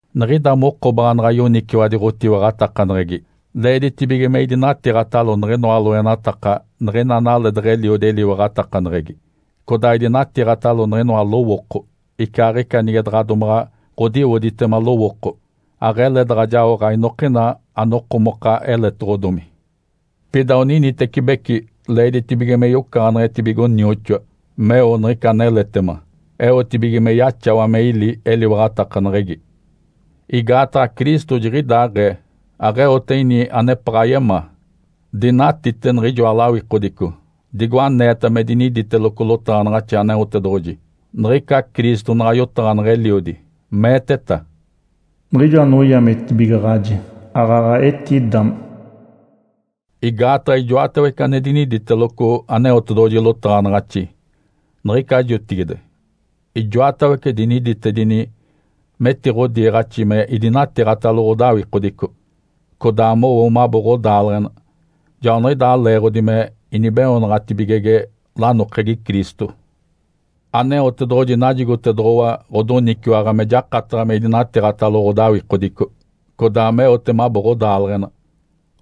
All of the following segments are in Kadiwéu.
Niɡ̶ida moko baanaɡ̶a yoniciwadi ɡ̶otiwaɡ̶atakaneɡ̶egi leeditibige me idinatiiɡ̶atalo niɡ̶inoa loenataka niɡ̶ina analee deɡ̶eliodi eliwaɡ̶atakaneɡ̶egi, codaa idinatiiɡ̶atalo niɡ̶inoa lowooko, icaaɡ̶ica nige daɡ̶a domaɡ̶a ɡ̶odiwoditema lowooko. Aɡ̶ele daɡ̶a jaoɡ̶a inokina anokomoka aneletoɡ̶odomi. Pida oninitecibeci leeditibige me yocaɡ̶aneɡ̶etibigo nioxoa, meo niɡ̶ica aneletema, eotibige me yaxawa me ili eliwaɡ̶atakaneɡ̶egi. Igaataɡ̶a Cristo jiɡ̶idaaɡ̶ee aɡ̶eote ini anepaɡ̶a yemaa. Dinatite niɡ̶ijoa lawikodico, digo aneeta me diniditeloco lotaɡ̶anaɡ̶axi Aneotedoɡ̶oji. Niɡ̶ica Cristo naɡ̶a yotaɡ̶aneɡ̶e Eliodi, meeteta, “Niɡ̶ijo anoyametibigaɡ̶aji, aaɡ̶aɡ̶a etidame.” Igaataɡ̶a ijoatawece ane diniditeloco Aneotedoɡ̶oji lotaɡ̶anaɡ̶axi, niɡ̶ica jotigide, ijoatawece diniditedini metiɡ̶odiiɡ̶axi me idinatiiɡ̶atalo ɡ̶odawikodico, codaa mowo mabo ɡ̶odaaleɡ̶ena. Joaniɡ̶idaa leeɡ̶odi me inibeoonaɡ̶atibigege lanokegi Cristo. Aneotedoɡ̶oji najigotedoɡ̶owa ɡ̶odoniciwaɡ̶a me jakataɡ̶a me idinatiiɡ̶atalo ɡ̶odawikodico, codaa meote mabo ɡ̶odaaleɡ̶ena.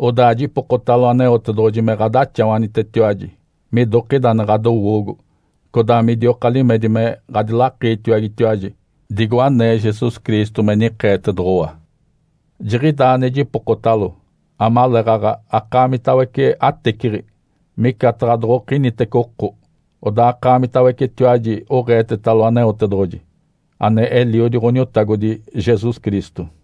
Odaa jipokotalo Aneotedoɡ̶oji me ɡ̶adaxawanitetiwaji midokida ane ɡ̶adowoogo, codaa midioka limedi me ɡ̶adilakiitiwagetiwaji, digo anee Jesus Cristo me nikeetedoɡ̶owa. Jiɡ̶idaa ane jipokotalo amaleeɡ̶aɡ̶a akaamitawece ateciɡ̶i, micataɡ̶a doɡ̶okinitece oko, odaa akaamitawecetiwaji oɡ̶eetetalo Aneotedoɡ̶oji, ane Eliodi Ǥoniotagodi Jesus Cristo.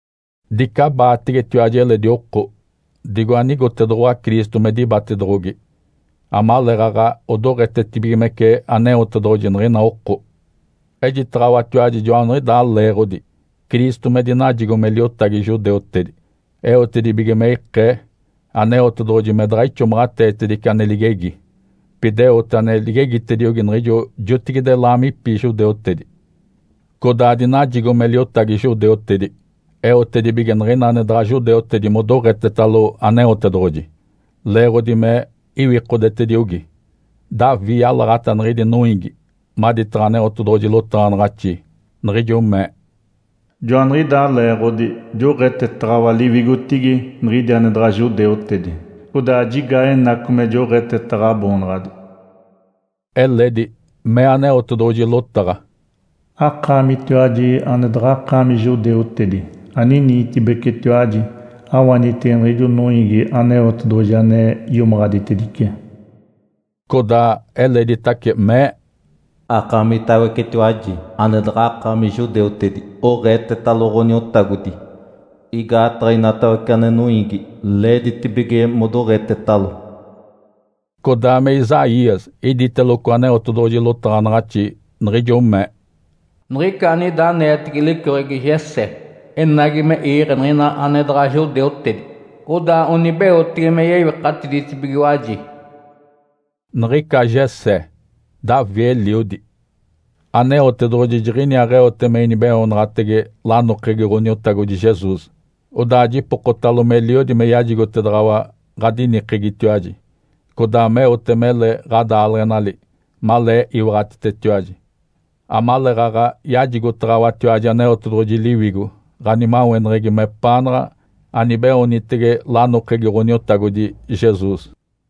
Dicabaategetiwaji eledi oko, digo anigotedoɡ̶owa Cristo me dibatedoɡ̶ogi, amaleeɡ̶aɡ̶a odoɡ̶etetibigimece Aneotedoɡ̶oji niɡ̶ina oko. Ejitaɡ̶awatiwaji joaniɡ̶idaa leeɡ̶odi Cristo me dinajigo me liotagi judeutedi, eotedibige me ikee Aneotedoɡ̶oji me daɡ̶a ixomaɡ̶ateetedice ane ligegi, pida eote ane ligegitediogi niɡ̶ijo jotigide laamipi judeutedi. Codaa dinajigo me liotagi judeutedi eotedibige niɡ̶ina ane daɡ̶a judeutedi modoɡ̶etetalo Aneotedoɡ̶oji, leeɡ̶odi me iwikodetediogi. Davi yalaɡ̶ata niɡ̶idi noiigi maditaɡ̶a Aneotedoɡ̶oji lotaɡ̶anaɡ̶axi, niɡ̶ijo mee, “Joaniɡ̶idaa leeɡ̶odi joɡ̶etetaɡ̶awa liwigotigi niɡ̶idi ane daɡ̶a judeutedi, codaa jigaa enaco me joɡ̶eteta Ǥaboonaɡ̶adi.” Eledi mee Aneotedoɡ̶oji lotaɡ̶a, “Akaamitiwaji ane daɡ̶akaami judeutedi, aniniitibecitiwaji, awanitege niɡ̶ijo noiigi Aneotedoɡ̶oji ane iomaɡ̶aditedice!” Codaa eleditace mee, “Akaamitawecetiwaji ane daɡ̶akaami judeutedi oɡ̶eetetalo Ǥoniotagodi! Igaataɡ̶a inatawece ane noiigi leeditibige modoɡ̶etetalo.” Codaa me Isaías iditeloco Aneotedoɡ̶oji lotaɡ̶anaɡ̶axi, niɡ̶ijo mee, “Niɡ̶ica anida aneetege licoɡ̶egi Jessé enagi me iiɡ̶e niɡ̶ina ane daɡ̶a judeutedi. Odaa onibeotege me yewikatiditibigiwaji.” (Niɡ̶ica Jessé, Davi eliodi). Aneotedoɡ̶oji jiɡ̶iniaaɡ̶eote me inibeoonaɡ̶atege lanokegi Ǥoniotagodi Jesus. Odaa jipokotalo meliodi me yajigotedaɡ̶awa ɡ̶adinikegitiwaji, codaa meote mele ɡ̶adaaleɡ̶enali malee iwaɡ̶atitetiwaji, amaleeɡ̶aɡ̶a yajigotaɡ̶awatiwaji Aneotedoɡ̶oji Liwigo ɡ̶animaweneɡ̶egi mepaanaɡ̶a anibeoonitege lanokegi Ǥoniotagodi Jesus.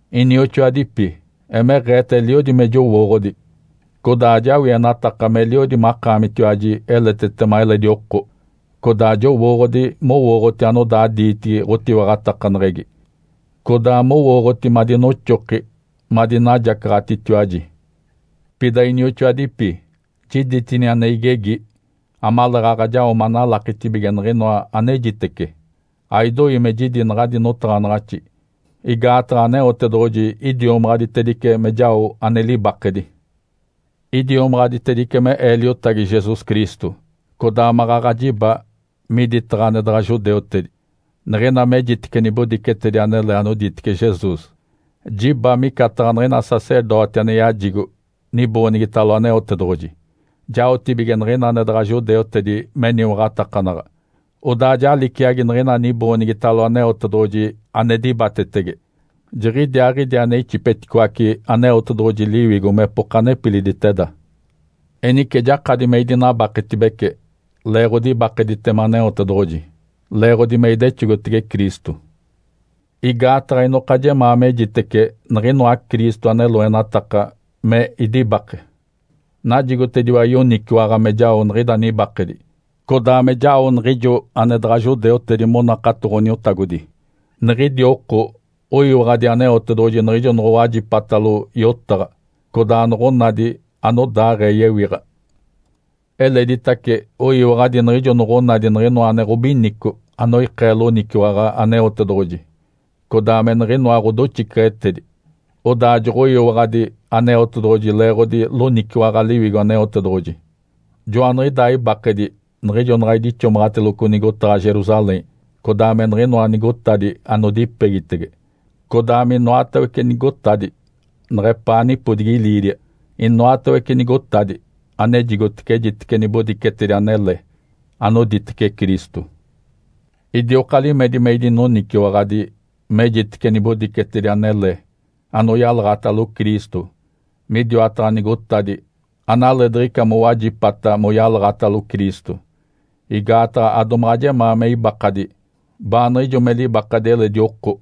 Inioxoadipi, emeɡ̶eeta eliodi me jowooɡ̶odi, codaa ajawienataka meliodi makaamitiwaji eletetema eledi oko, codaa jowooɡ̶odi mowooɡ̶oti anodaa diitigi ɡ̶otiwaɡ̶atakaneɡ̶egi, codaa mowooɡ̶oti madinoxoki madinajacaɡ̶atitiwaji. Pida, inioxoadipi, jiditini ane igegi amaleeɡ̶aɡ̶a jao manalakitibige niɡ̶inoa anejitece. Aidoi me jidi naɡ̶adi notaɡ̶anaɡ̶axi, igaataɡ̶a Aneotedoɡ̶oji idiomaɡ̶aditedice me jao ane libakedi. Idiomaɡ̶aditedice me ee liotagi Jesus Cristo, codaa maɡ̶aɡ̶a jiba miditaɡ̶a ane daɡ̶a judeutedi. Niɡ̶ina mejitece nibodicetedi anele anoditece Jesus, jiba micataɡ̶a niɡ̶ina sacerdoti ane yajigo niboonigitalo Aneotedoɡ̶oji. Jaotibige niɡ̶ina ane daɡ̶a judeutedi meniwaɡ̶atakanaɡ̶a, odaa ja liciagi niɡ̶ina niboonigitalo Aneotedoɡ̶oji ane dibatetege, jiɡ̶idiaaɡ̶idi ane ixipeticoace Aneotedoɡ̶oji Liwigo mepoka nepiliditeda. Enice jakadi me idinabaketibece leeɡ̶odi ibakeditema Aneotedoɡ̶oji, leeɡ̶odi me idexogotege Cristo. Igaataɡ̶a inoka jemaa mejitece niɡ̶inoa Cristo ane loenataka me idibake. Najigotediwa yoniciwaɡ̶a me jao niɡ̶ida nibakedi, codaa me jao niɡ̶ijo ane daɡ̶a judeutedi monakato Ǥoniotagodi. Niɡ̶idi oko oyiwaɡ̶adi Aneotedoɡ̶oji niɡ̶ijo noɡ̶owajipatalo yotaɡ̶a, codaa noɡ̶onadi anodaaɡ̶ee yewiɡ̶a. Eleditace oyiwaɡ̶adi niɡ̶ijo noɡ̶onadi niɡ̶inoa ane ɡ̶obinico anoikee loniciwaɡ̶a Aneotedoɡ̶oji, codaa me niɡ̶inoa ɡ̶odoxiceɡ̶etedi. Odaa joɡ̶oyiwaɡ̶adi Aneotedoɡ̶oji leeɡ̶odi loniciwaɡ̶a Liwigo Aneotedoɡ̶oji. Joaniɡ̶idaa ibakedi niɡ̶ijo naɡ̶a idixomaɡ̶ateloco nigotaɡ̶a Jerusalém, codaa me niɡ̶inoa nigotadi anodipegitege, codaa minoatawece nigotadi neɡ̶epaa nipodigi Ilíria. Inoatawece nigotadi anejigotece ejitece nibodicetedi anele anoditece Cristo. Idioka limedi me idinoniciwaɡ̶adi mejitece nibodicetedi anele anoyalaɡ̶atalo Cristo midiwataɡ̶a nigotadi analee diɡ̶ica mowajipata moyalaɡ̶atalo Cristo. Igaataɡ̶a adomaɡ̶a jemaa me ibakadi baaniɡ̶ijo me libakadi eledi oko,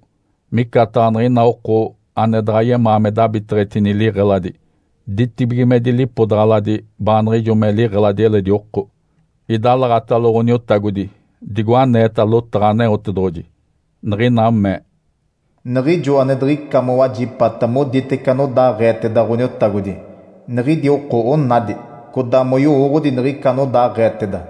micataɡ̶a niɡ̶ina oko ane daɡ̶a yemaa me dabiteɡ̶etini liɡ̶eladi ditibigimedi lipodaɡ̶aladi baaniɡ̶ijo me liɡ̶eladi eledi oko. Idalaɡ̶atalo Ǥoniotagodi digo aneeta lotaɡ̶a Aneotedoɡ̶oji, niɡ̶ina mee, “Niɡ̶ijo ane diɡ̶ica mowajipata moditece anodaaɡ̶eeteda Ǥoniotagodi, niɡ̶idi oko onadi, codaa moyowooɡ̶odi niɡ̶ica anodaaɡ̶eeteda.”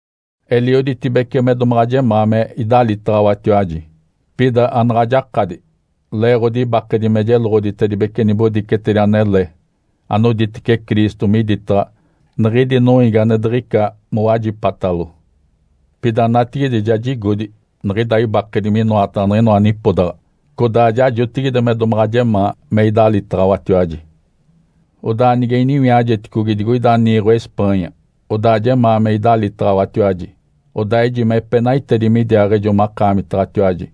Elioditibece me domaɡ̶a jemaa me idalitaɡ̶awatiwaji, pida anaɡ̶a jakadi leeɡ̶odi ibakedi me jeloɡ̶oditibece nibodicetedi anele anoditece Cristo miditaɡ̶a niɡ̶idi noiigi ane diɡ̶ica mowajipatalo. Pida natigide ja jigodi niɡ̶ida ibakedi minoataɡ̶a niɡ̶inoa nipodaɡ̶a. Codaa ja jotigide me domaɡ̶a jemaa me idalitaɡ̶awatiwaji. Odaa nige iniwiajeticogi digoida niiɡ̶o Espanha, odaa jemaa me idalitaɡ̶awatiwaji. Odaa ejime epenaitedi midiaaɡ̶ejo makaamitaɡ̶atiwaji,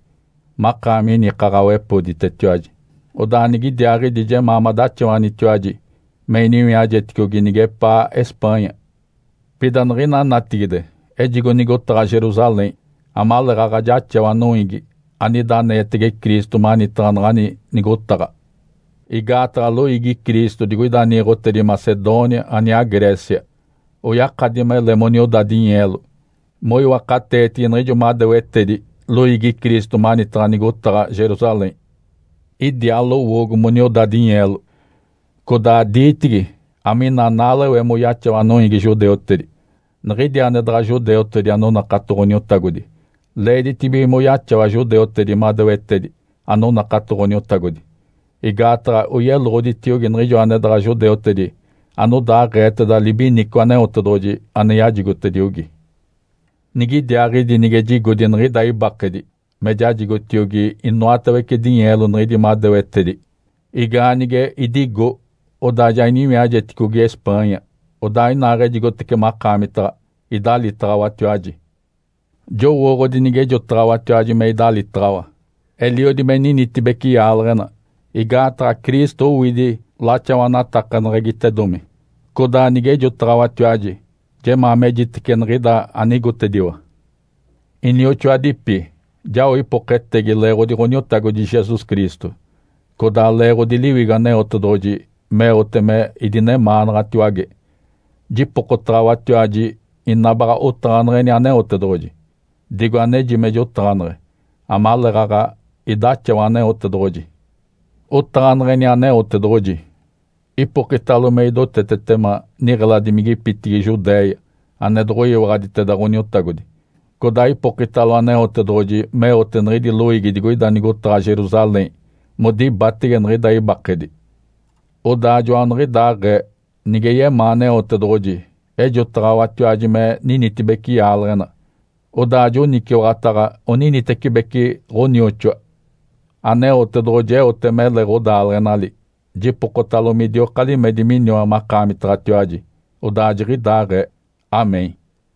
makaami inikaɡ̶awepoditetiwaji, odaa nigidiaaɡ̶idi jemaa madaxawanitiwaji me iniwiajeticogi nigepaa Espanha. Pida niɡ̶ina natigide ejigo nigotaɡ̶a Jerusalém amaleeɡ̶aɡ̶a jaxawa noiigi anida aneetege Cristo manitaɡ̶a naɡ̶ani nigotaɡ̶a. Igaataɡ̶a loiigi Cristo digoida niiɡ̶otedi Macedônia aniaa Grécia oyakadi mele monioda dinyeelo moiwakateetigi niɡ̶ijo madewetedi loiigi Cristo manitaɡ̶a nigotaɡ̶a Jerusalém. Idiaa lowoogo monioda dinyeelo, codaa diitigi amina naalewe moyaxawa noiigi judeutedi. Niɡ̶idi ane daɡ̶a judeutedi anonakato Ǥoniotagodi leeditibige moyaxawa judeutedi madewetedi anonakato Ǥoniotagodi. Igaataɡ̶a oyeloɡ̶oditiogi niɡ̶ijo ane daɡ̶a judeutedi anodaaɡ̶eeteda libinico Aneotedoɡ̶oji ane yajigotediogi. Nigidiaaɡ̶idi nige jigodi niɡ̶ida ibakedi me jajigotiogi inoatawece dinyeelo niɡ̶idi madewetedi. Igaanige idigo, odaa ja iniwiajeticogi Espanha, odaa inaaɡ̶ejigotece makaamitaɡ̶a, idalitaɡ̶awatiwaji. Jowooɡ̶odi nigejotaɡ̶awatiwaji me idalitaɡ̶awa, eliodi me ninitibece yaaleɡ̶ena, igaataɡ̶a Cristo owidi laxawanaɡ̶atakaneɡ̶egitedomi. Codaa nigejotaɡ̶awatiwaji jemaa mejitece niɡ̶ida anigotediwa. Inioxoadipi, jao ipoketegi leeɡ̶odi Ǥoniotagodi Jesus Cristo, codaa leeɡ̶odi Liwigo Aneotedoɡ̶oji meote me idinemaanaɡ̶atiwage. Jipokotaɡ̶awatiwaji ina baɡ̶a otaɡ̶aneɡ̶eni Aneotedoɡ̶oji, digo aneji me jotaɡ̶aneɡ̶e amaleeɡ̶aɡ̶a idaxawa Aneotedoɡ̶oji. Otaɡ̶aneɡ̶eni Aneotedoɡ̶oji, ipokitalo me idotetetema niɡ̶eladimigipitigi Judéia ane doɡ̶oyiwaɡ̶aditeda Ǥoniotagodi, codaa ipokitalo Aneotedoɡ̶oji meote niɡ̶idi loiigi digoida nigotaɡ̶a Jerusalém modibatege niɡ̶ida ibakedi. Odaa joaniɡ̶idaaɡ̶ee, nige yemaa Aneotedoɡ̶oji, ejotaɡ̶awatiwaji me ninitibece yaaleɡ̶ena, odaa joniciwaɡ̶ataɡ̶a oninitecibeci ɡ̶onioxoa. Aneotedoɡ̶oji eote mele ɡ̶odaaleɡ̶enali. Jipokotalo midioka limedi miniwa makaamitaɡ̶atiwaji. Odaa jiɡ̶idaaɡ̶ee. (Amém.)